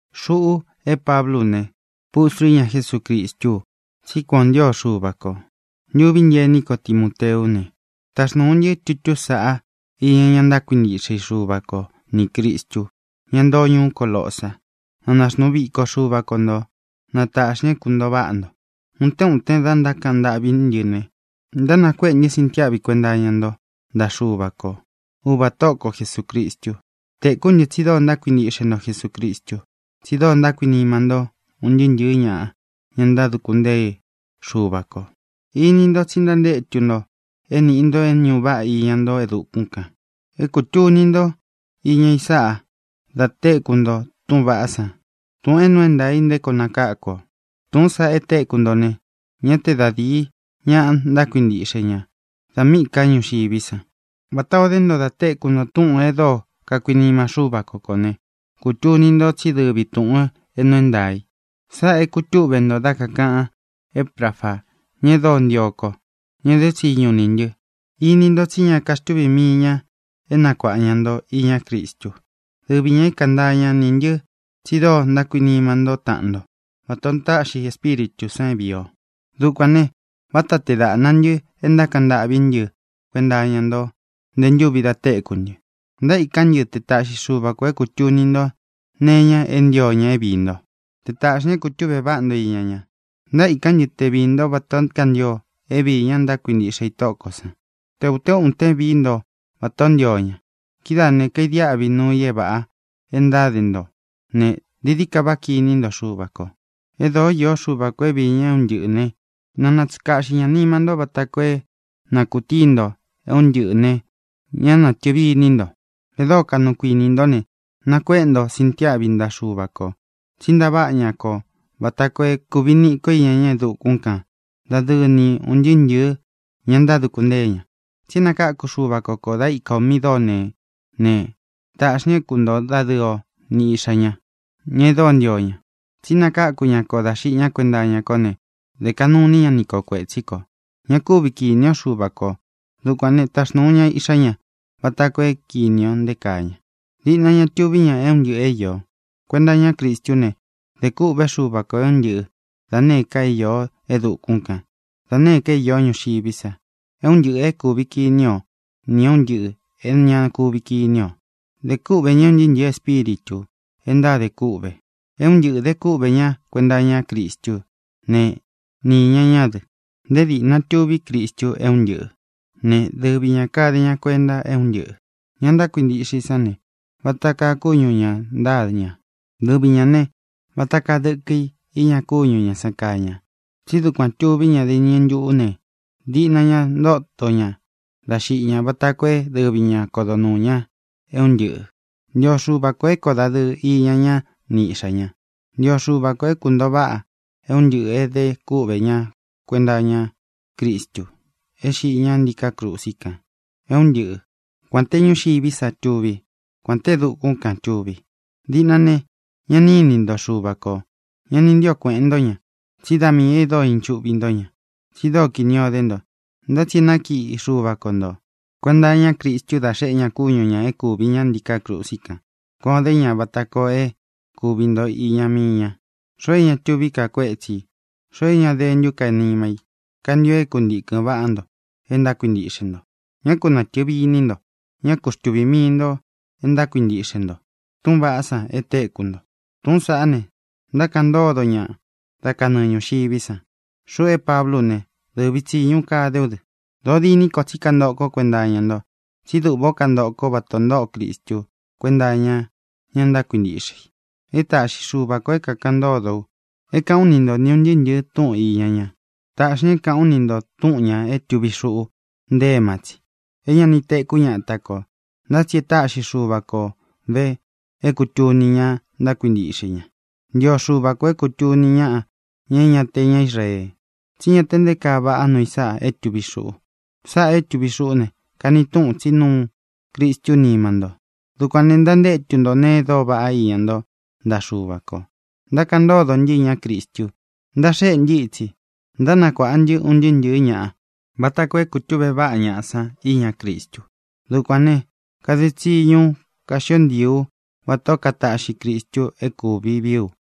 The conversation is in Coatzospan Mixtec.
Xuꞌu é Pablú u ne, pustru íña Jesúcristú u, tsí kuan ō ntío Xuva kō. Ntuví ntɨ ení ko Timoteú ne, taxnūu ntɨ́ tutú sāꞌá iña ña ntákuintiꞌxe i Xuva ko nī Cristu, ñá ntoo ñuú Colosa. Na naxnuu viko Xuva ko ntō. Na tāꞌxi ña é kuntōo váꞌa nto. Utén uten da ntákaꞌan ntâꞌví ntɨ ne, ntánakuéꞌe ntɨ́ sintiáꞌvi kuenta iña nto ntaꞌa Xuva ko, Uvā Tóꞌo ko Jesūcristu. Tēkú ntɨ tsi dóo ntákuintiꞌxe nto Jesucristu, tsi dóo ntákuinima nto un ntɨɨ́ ntɨ̄ɨ́ ñaꞌa, ña ntáduku ntée Xuva kō. Ini nto tsi ntántétu nto é nīꞌi nto é ñūꞌu váꞌa iña nto e dukún kān. É kūtuni nto iña i sáꞌa da téku nto túꞌūn vaꞌá san, túꞌūn é nuu é ntaā i nté koo nakáku o. Tūꞌún san e téku nto ne, ñá te da dīi ñaꞌa ntákuintiꞌxe ña da míꞌī ká ñuxiví san, vatā o dé nto da téku nto túꞌūn e dóo kakuinima Xúva ko kō né, kūtuni nto tsí dɨvi tūꞌun é nuu é ntaā i. Sáꞌā é kūtúꞌve nto dá kāꞌan Éprafa, ña e dóo ntio ko, ña e dé tsiñu niꞌī ntɨ. Ini nto tsí ña kaxtuví mii ña é nakuāꞌa ña nto iñá Cristu. Dɨvi ñā é kantaa ña nī ntɨ tsi dóo ntákuinima ntó taꞌan nto vata ō táꞌxi Espíritū san é vīi o. Dukuān ne, váta tee dāꞌna ntɨ e ntákaꞌan ntâꞌví ntɨ kuenta iña nto nte ntúvi da téku ntɨ. Ntaíkán ntɨ te taꞌxi Xuva kō é kūtuni nto nee iña e ntío ña é viī ntó, te tāꞌxi ña é kūtuꞌve váꞌa nto iña ña. Ntaíkán ntɨ te viī ntó vatā ó kantio é vīi ña ntákuintiꞌxe i Tóꞌo kō sán, te ūtén uten vií nto vatā ó ntio ña. Kidáā ne, kadiáꞌvi nuu i é vāꞌa e ntáde nto ne, dií dií ka váꞌa kiní nto Xuva kō. E dóo īó Xuva kō é viī ña é un ntɨꞌɨ̄ né, na natsuꞌun kāꞌxi ña nima ntó vata koo é na kūtíi nto é un ntɨꞌɨ̄ ne, ña natɨvi iní nto. E dóo kaꞌnu kuini ntó ne, nakuéꞌe nto sintiáꞌvi ntaꞌa Xuva kō, tsí ntaváꞌa ña kō vata koo é kūvi niꞌí ko iña ña e dukún kān dadɨɨ ni un ntɨɨ́ ntɨ̄ɨ́ ña ntáduku ntée ña. Tsi é nakáku Xuva ko kō dá ika ō míꞌī dóo neé ne, taꞌxī ña é kuntoo dadɨɨ o ni Iꞌxā ña, ña e dóo ntio ña. Tsi nakáku ña kō dá xiꞌi ñá kuenta iña kó ne, dē kaꞌnu iní ña ni kō kuetsí kō. Ña kúvi kīní o Xuva kō. Dukuān né, taxnūu ña Iꞌxá ña vata koo é kīni o nté kaa ña. Diꞌna ña tuví ña e é un ntɨꞌɨ̄ é īó. Kuenta iñá Cristú ne, dē kûꞌvé Xuva kō é un ntɨꞌɨ, da nēé ka é īó e dukún kān, da nēé ka é īó ñuxiví sa, é un ntɨꞌɨ̄ é kuvi kini o nī é un ntɨꞌɨ̄ é ña kuvi kiní ō. Dē kúꞌvē ñá un ntɨɨ́ ntɨ̄ɨ́ espíritū e ntáde kûꞌve. É un ntɨꞌɨ̄ de kúꞌvē ñá kuenta iña Cristú ne, ni īña ñá dɨ. Nté dīꞌna tuví Cristu é un ntɨꞌɨ̄ né, dɨvi ñā kade ña kuenta é un ntɨꞌɨ̄. Ña ntákuintíꞌxe i sán ne, vata kaa kúñu ñā ntáa ña. Dɨvi ñā ne, vata kaa dɨkɨ í iña kúñu ñā san kaa ña. Tsí dukuān tuví ña dá iñɨ ntuꞌū ne, diꞌna ña ntóto ña dá xiꞌi ñá, vata koo é dɨvi ña kodo nuū ña é un ntɨꞌɨ̄. Ntio Xuva kō é koo dadɨɨ iña ñá ni Iꞌxā ña. Ntio Xuva kō é kūntoo váꞌa é un ntɨꞌɨ̄ é de kúꞌvē ña kuenta iña Cristu é xiꞌi ñá ntiká krusi kan, é un ntɨꞌɨ, kuān té ñuxiví sa tuví, kuān té e dukún kan tūvi. Díꞌnā ne, ñá ni inī ntó Xuva kō. Ña ni ntío kuēꞌen ntó ña, tsí da miī e dóo inchúꞌvi nto ña, tsi dóo kini o dé nto. Ntá tsi e nákiꞌi Xuva ko nto kuēnta iñá Cristu dá xeꞌé ña kúñu ñā é kuvī ñá ntiká krusi kan. Kuan ō dé ña vata koo é kūvi nto iña mii ña, xoo é ña tuví ka kuétsi ī, xoo é ña dentú ka nima i. Kantio é kuntīkɨn vaꞌá nto e ntákuintiꞌxe nto. Ñá ku natɨ̄vi iní nto. Ñá ku xtuvī mii nto e ntákuintiꞌxe nto túꞌūn vaꞌá san e téku nto. Túꞌūn saꞌá ne, ntákaꞌan ntódo ñaꞌa dá kanɨɨ ñūxiví san. Xuꞌu é Pablú u ne, dɨvi tsīñu kade ú dɨ. Dōo diní ko tsí kantoꞌo kó kuenta iña nto, tsí duꞌvā ó kantoꞌo kó vatā o ntóꞌo Cristu kuénta iña ña ntákuintiꞌxe i. E táꞌxi Xuva kō é kākaꞌan ntódo u, é kāꞌán u ni nto ūn ntɨɨ́ ntɨ̄ɨ́ túꞌūn iña ña. Tāꞌxi ña é kāꞌán u ni ntō túꞌun ñā é tuvi xuꞌu nte éma tsi, é ña ni tēkú ñata kō. Ntá tsi e táꞌxi Xuva ko vē é kūtuni ña ntákuintíꞌxe i ña. Ntio Xuva kō é kūtuni ñáꞌa, ña é ña te ña Israee, tsí ña te nté kaa vaꞌá nuu i sáꞌa é tuvi xuꞌu. Sáꞌā é tuvi xuꞌú ne, kani túꞌun tsí nuu Cristu nima nto. Dukuān ne, ntantétu nto nēe e dóo vaꞌá iña nto ntaꞌa Xuva kō. Ntákaꞌan ntódo ntɨ́ iñá Cristu. Ntaxéꞌe ntɨ́ itsi, ntánakuāꞌa ntɨ́ un ntɨɨ́ ntɨ̄ɨ́ ñaꞌa vata koo é kūtúꞌvē váꞌa ñaꞌa san iñá Cristu. Dukuān ne, kade tsiñu ú, kaxió ntii ú vatā ó kataꞌxi Cristu é kūvi vií u.